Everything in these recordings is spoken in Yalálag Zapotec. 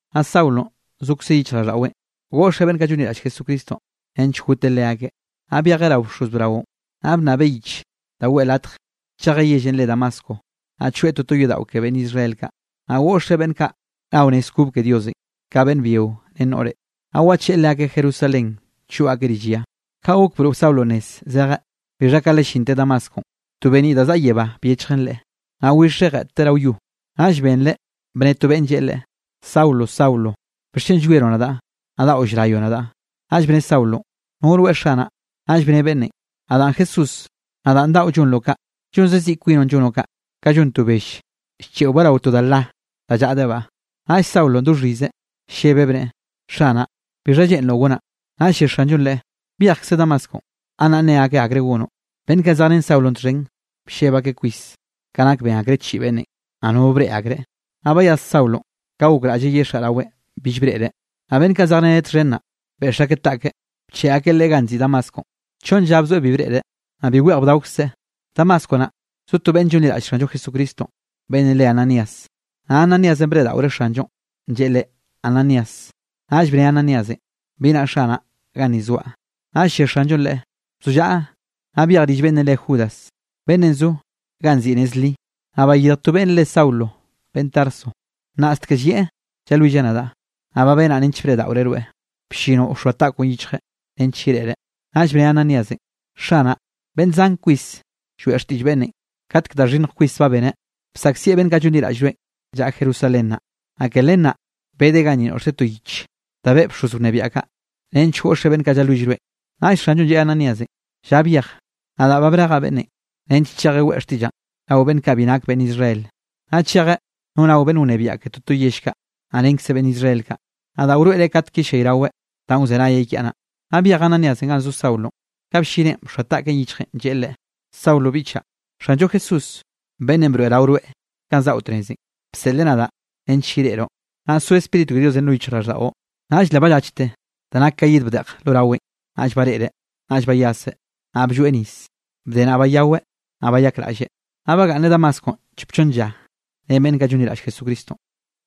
Naꞌ Saulonꞌ zokze yichjraꞌlldaꞌweꞌ goꞌxeꞌ beꞌnn kaꞌ llonliraꞌll Jesucristonꞌ, nench goteꞌ leakeꞌ. Naꞌ byejeꞌ rao bxoz braonꞌ, naꞌ bnnabeꞌ yich da weꞌe latj chejeꞌ yellenꞌ re Damasco, naꞌ choeꞌ toto yodaꞌo ke beꞌnn Israel kaꞌ, naꞌ goꞌxeꞌ beꞌnn kaꞌ nao nez kob ke Diosenꞌ, ka beꞌnn byio ren noꞌre, naꞌ wacheꞌe leakeꞌ Jerusalén choꞌ akeꞌ rill ya. Ka gok broꞌ Saulonꞌ nez zejeꞌ, bixha ka le llinteꞌ Damasconꞌ, to beniꞌ da zaꞌa yebá byechjen leꞌe. Naꞌ wixeꞌ jeꞌtteꞌ rao yo, naꞌll benreꞌ bne to beꞌnn lleꞌe leꞌe: —Saulo, Saulo, ¿bixchen llwieroꞌ nadaꞌ, naꞌ daꞌo llrayoꞌ nadaꞌ? Naꞌll bne Saulonꞌ: —¿No rweꞌ, Xanaꞌ? Naꞌll bne beꞌnnenꞌ: —Nadaꞌn Jesús, nadaꞌn daꞌo llonroꞌ kaꞌ, llonze ziꞌ kwinoꞌn llonoꞌ kaꞌ, ka llon to bell llcheꞌobaꞌ rao to da la, da llaꞌdebaꞌ. Naꞌll Saulonꞌ do xhizeꞌ, llebeꞌ bneꞌe: —Xanaꞌ, ¿Bixha lleꞌnroꞌ gonaꞌ? Naꞌll lle Xanllo leꞌe: —Byejkze Damasconꞌ, gannaꞌ nne akeꞌ akre gonoꞌ. Beꞌnn kaꞌ zejrén Saulonꞌ txhen blleb akeꞌ kwis, ka nak ben akreꞌ chiꞌi beꞌnnenꞌ, naꞌ nono breꞌe akreꞌ. Naꞌ bayas Saulonꞌ, ka gokraꞌlleꞌ yexaꞌ raweꞌn bill breꞌreꞌ. Naꞌ beꞌnn kaꞌ zejreneꞌ txhen naꞌ, beꞌx akeꞌ taꞌkeꞌ, bcheꞌe akeꞌ leꞌe ganꞌ nziꞌi Damasconꞌ. Chonn lla bzoeꞌ bi breꞌreꞌ, naꞌ bi weꞌj bdaokzeꞌ. Damasco naꞌ, zo to beꞌnn llonliraꞌll Xanllo Jesucristonꞌ beꞌnn re Ananías, naꞌ Ananíasenꞌ breꞌdaꞌoreꞌ Xanllonꞌ, lleꞌe leꞌe: —¡Ananías! Naꞌll bne Ananíasenꞌ: —Bi naꞌ, Xanaꞌ, ganni zoaꞌ. Naꞌll lle Xanllonꞌ leꞌe: —Bzollaꞌa, naꞌ byej rill beꞌnnenꞌ re Judas, beꞌnnenꞌ zo ganꞌ nziꞌi Nez Li, naꞌ bayirj to beꞌnne re Saulo beꞌnn Tarso, nnaꞌstek llieꞌ llalwilleꞌ nadaꞌ. Naꞌ ba benaꞌ nench breꞌdaꞌoreꞌ rweꞌ, bllinoꞌ wxoa taꞌkoꞌn yichjeꞌ, nench yereꞌreꞌ. Naꞌll bne Ananíasenꞌ: —Xanaꞌ, beꞌnn zan kwis lloeꞌ xtiꞌll beꞌnnenꞌ, katek da xhinnj kwis ba beneꞌ, bsaꞌkzieꞌ beꞌnn kaꞌ llonliraꞌll rweꞌn llaꞌa Jerusalén naꞌ. Naꞌ ke len naꞌ, bedeꞌ ganni noꞌxteꞌ to yich danꞌ beꞌe bxoz wnebiaꞌ kaꞌ, nench goꞌxeꞌ beꞌnn kaꞌ llalwill rweꞌn. Naꞌll Xanllonꞌ lleꞌe Ananíasenꞌ: —Lla byej, nadaꞌ ba brejaꞌ beꞌnnenꞌ, nench chejeꞌ weꞌe xtiꞌllaꞌn rao beꞌnn kaꞌ bi nak beꞌnn Israel, naꞌ chejeꞌ no rao beꞌnn wnebiaꞌ ke toto yell kaꞌ, naꞌ renkze beꞌnn Israel kaꞌ. Nadaꞌ wroeꞌreꞌ katek yellayraweꞌ danꞌ wzenayeꞌ kiaꞌ naꞌ. Naꞌ byej Ananíasenꞌ ganꞌ zo Saulonꞌ, ka bllineꞌn bxoa taꞌkeꞌn yichjeꞌ, lleꞌe leꞌe: —Saulo biꞌchaꞌ, Xanllo Jesús beꞌnnenꞌ broeꞌrao rweꞌ kanꞌ zaꞌo tnezenꞌ, bseꞌleꞌ nadaꞌ nench yereꞌroꞌ, naꞌ so Spíritu ke Diosenꞌ lo yichjraꞌlldaꞌo. Naꞌll le ballachte da nak ka yid bdeꞌj lo raweꞌn, naꞌll bareꞌreꞌ. Naꞌll bayaseꞌ, naꞌ blloeꞌ nis. Bde naꞌ, bayaweꞌ, naꞌ bayakraꞌlleꞌ. Naꞌ bagaꞌnneꞌ Damasconꞌ chop chonn lla ren beꞌnn kaꞌ llonliraꞌll Jesucristonꞌ.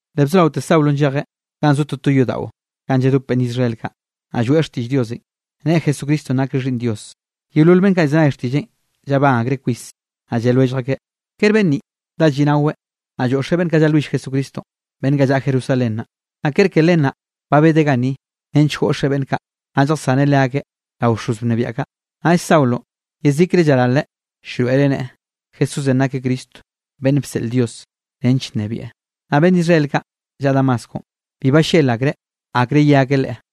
Le bzoraote Saulonꞌ llejeꞌ ga zo toto yodaꞌo ganꞌ lladop beꞌnn Israel kaꞌ, naꞌ lloeꞌ xtiꞌll Diosenꞌ, neꞌe Jesucristonꞌ nakeꞌ Xhiꞌnn Dios. Yeolol beꞌnn kaꞌ llzenay xtiꞌlleꞌn, llabán akreꞌ kwis, naꞌ lle lwellj akeꞌ: —¿Kere beꞌnn ninꞌ dá lliꞌnaweꞌ, naꞌ lloꞌxeꞌ beꞌnn kaꞌ llalwill Jesucristonꞌ, beꞌnn kaꞌ llaꞌa Jerusalén naꞌ? ¿Naꞌ kere ke len naꞌ ba bedeꞌ ganni nench goꞌxeꞌ beꞌnn kaꞌ, naꞌ lljasaneꞌ leakeꞌ rao bxoz wnebiaꞌ kaꞌ? Naꞌll Saulonꞌ yezikre llaralreꞌ llroeꞌreꞌ neꞌe, Jesúsenꞌ nakeꞌ Cristo beꞌnn bseꞌl Dios nench nnebieꞌ. Naꞌ beꞌnn Israel kaꞌ llaꞌa Damasconꞌ, bi ballel akreꞌ akre ye akeꞌ leꞌe.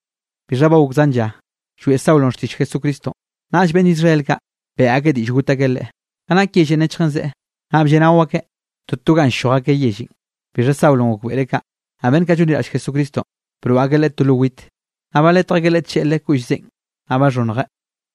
Bixha ba gok zan lla, lloeꞌ Saulonꞌ xtiꞌll Jesucristonꞌ, naꞌll beꞌnn Israel kaꞌ, beꞌe akeꞌ diꞌll got akeꞌ leꞌe. Ka nak yellenꞌ nechjen zeꞌe, naꞌ blleꞌnao akeꞌ toto ganꞌ ll-lloj akeꞌ yellenꞌ. Bixha Saulonꞌ gokbeꞌreꞌ kaꞌ. Naꞌ beꞌnn kaꞌ llonliraꞌll Jesucristonꞌ, broꞌ akeꞌ leꞌe to lo wit, naꞌ baletj akeꞌ leꞌe tlleꞌle koꞌll zeꞌen, naꞌ baxhonnjeꞌ.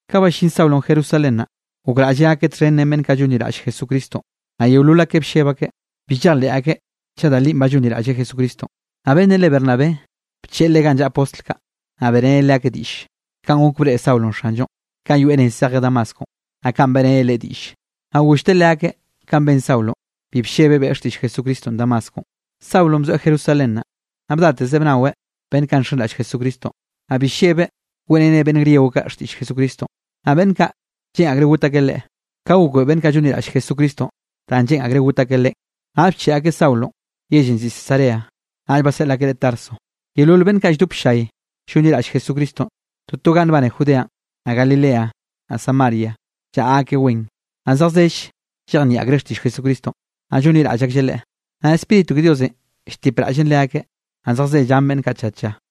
Ka ballín Saulonꞌ Jerusalén naꞌ, gokraꞌlleꞌ gakeꞌ txhen ren beꞌnn kaꞌ llonliraꞌll Jesucristonꞌ, naꞌ yeolol akeꞌ blleb akeꞌ, bi llejleꞌ akeꞌ chaꞌ da linꞌ ba llonliraꞌlleꞌ Jesucristonꞌ. Naꞌ beꞌnnenꞌ re Bernabé bcheꞌe leꞌe ganꞌ llaꞌa postl kaꞌ, naꞌ beꞌreneꞌ leakeꞌ diꞌll, kanꞌ gok breꞌe Saulonꞌ Xanllonꞌ, kanꞌ yoeꞌ nez zejeꞌ Damasconꞌ, naꞌ kanꞌ beꞌreneꞌ leꞌe diꞌll. Naꞌ gollteꞌ leakeꞌ kanꞌ ben Saulonꞌ, bi bllebeꞌ beꞌe xtiꞌll Jesucristonꞌ Damasconꞌ. Saulonꞌ bzoeꞌ Jerusalén naꞌ, naꞌ bdateze bnaweꞌ beꞌnn kaꞌ nxenraꞌll Jesucristonꞌ. Naꞌ bi llebeꞌ weꞌreneꞌ beꞌnn griego kaꞌ xtiꞌll Jesucristonꞌ, naꞌ beꞌnn kaꞌ, lleꞌn akreꞌ got akeꞌ leꞌe. Ka gokbeꞌe beꞌnn kaꞌ llonliraꞌll Jesucristonꞌ danꞌ lleꞌn akreꞌ got akeꞌ leꞌen, naꞌll bcheꞌe akeꞌ Saulonꞌ yellenꞌ nziꞌi Cesarea, naꞌll baseꞌl akeꞌ leꞌe Tarso. Yeolol beꞌnn kaꞌ ba lldop ll-llay llonliraꞌll Jesucristonꞌ toto ganꞌ nbane Judeanꞌ, naꞌ Galilea, naꞌ Samaria llaꞌa akeꞌ wen, naꞌ zejzell llejnieꞌ akreꞌ xtiꞌll Jesucristonꞌ, naꞌ llonliraꞌll aklleꞌ Leꞌe. Naꞌ Spíritu ke Diosenꞌ lltipraꞌllen leakeꞌ, naꞌ zejze llan beꞌnn kaꞌ tlla tlla.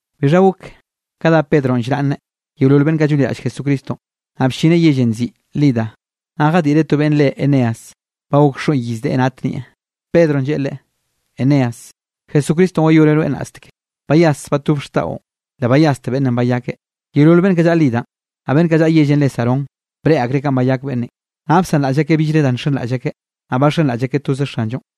Bixha gok ka dá Pedronꞌ llraꞌnneꞌ yeolol beꞌnn kaꞌ llonliraꞌll Jesucristonꞌ. Naꞌ bllineꞌ yellenꞌ nziꞌi Lida. Naꞌ jadiꞌreꞌ to beꞌnn re Eneas. Ba gok xoꞌn iz deꞌe nat nieꞌ. Pedronꞌ lleꞌe leꞌe: —Eneas, Jesucristonꞌ wayoneꞌ rweꞌ nnaꞌsteke, bayas batob xtaꞌon. Le bayaste beꞌnnenꞌ bayakeꞌ. Yeolol beꞌnn kaꞌ llaꞌa Lidanꞌ, naꞌ beꞌnn kaꞌ llaꞌa yellenꞌ re Sarón breꞌe akreꞌ kanꞌ bayak beꞌnnenꞌ, naꞌ bsanraꞌll akeꞌ billre da llxenraꞌll akeꞌ, naꞌ baxenraꞌll akeꞌ toze Xanllonꞌ.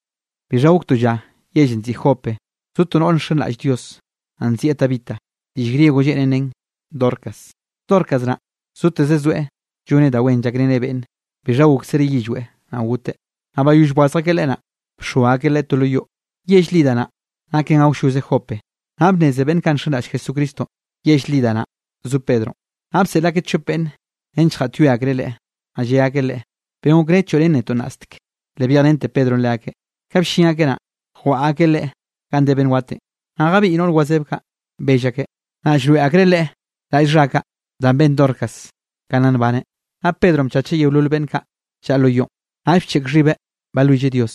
Bixha gok to lla yellenꞌ nziꞌi Jope, zo to noꞌr nxenraꞌll Dios, naꞌ nzieꞌ Tabita, diꞌll griego lleꞌnen nen Dorcas. Dorcas naꞌ zoteze zoeꞌ lloneꞌ da wen llakreneꞌ beꞌnne. Bixha goksereꞌ yillweꞌ, naꞌ goteꞌ. Naꞌ bayoll bwazj akeꞌ leꞌe naꞌ, bxoa akeꞌ leꞌe to lo yoꞌ. Yell Lida naꞌ, naken awlloze Jope, naꞌ bnneze beꞌnn kaꞌ nxenraꞌll Jesucristonꞌ, yell Lida naꞌ zo Pedronꞌ, naꞌ bseꞌl akeꞌ chop beꞌnn nench gaꞌtyoe akreꞌ leꞌe, naꞌ lle akeꞌ leꞌe: —Ben okré choꞌrén netoꞌ nnastek. Le byejrente Pedronꞌ leakeꞌ. Ka bllin akeꞌ naꞌ, jwaꞌa akeꞌ leꞌe ganꞌ de beꞌnn watenꞌ, naꞌ jabiꞌy noꞌr wazeb kaꞌ, bell akeꞌ, naꞌ llroeꞌ akreꞌ leꞌe raꞌll xha kaꞌ da ben Dorcas ka nna nbaneꞌ. Naꞌ Pedronꞌ bchacheꞌ yeolol beꞌnn kaꞌ llaꞌa lo yoꞌn, naꞌll bcheꞌk xhibeꞌ balwilleꞌ Dios.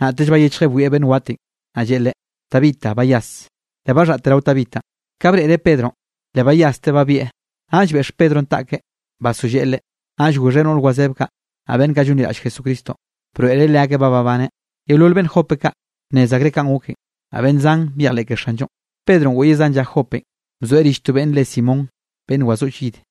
Naꞌtell bayechjeꞌ bwieꞌ beꞌnn watenꞌ, naꞌ lleꞌe leꞌe: —¡Tabita, bayas! Le baxaꞌte rao Tabitanꞌ. Ka breꞌreꞌ Pedronꞌ, le bayasteꞌ babieꞌ. Naꞌll beꞌx Pedronꞌ taꞌkeꞌ basolleꞌe leꞌe, naꞌll goxheꞌ noꞌr wazeb kaꞌ, naꞌ beꞌnn kaꞌ llonliraꞌll Jesucristonꞌ, broeꞌreꞌ leakeꞌ ba babaneꞌ. Yeolol beꞌnn Jope kaꞌ, bnnez akreꞌ kanꞌ goken, naꞌ beꞌnn zan byejleꞌ ke Xanllonꞌ. Pedronꞌ goꞌyeꞌ zan lla Jopenꞌ, bzoeꞌ rill to beꞌnn re Simón beꞌnn wazoꞌll yid.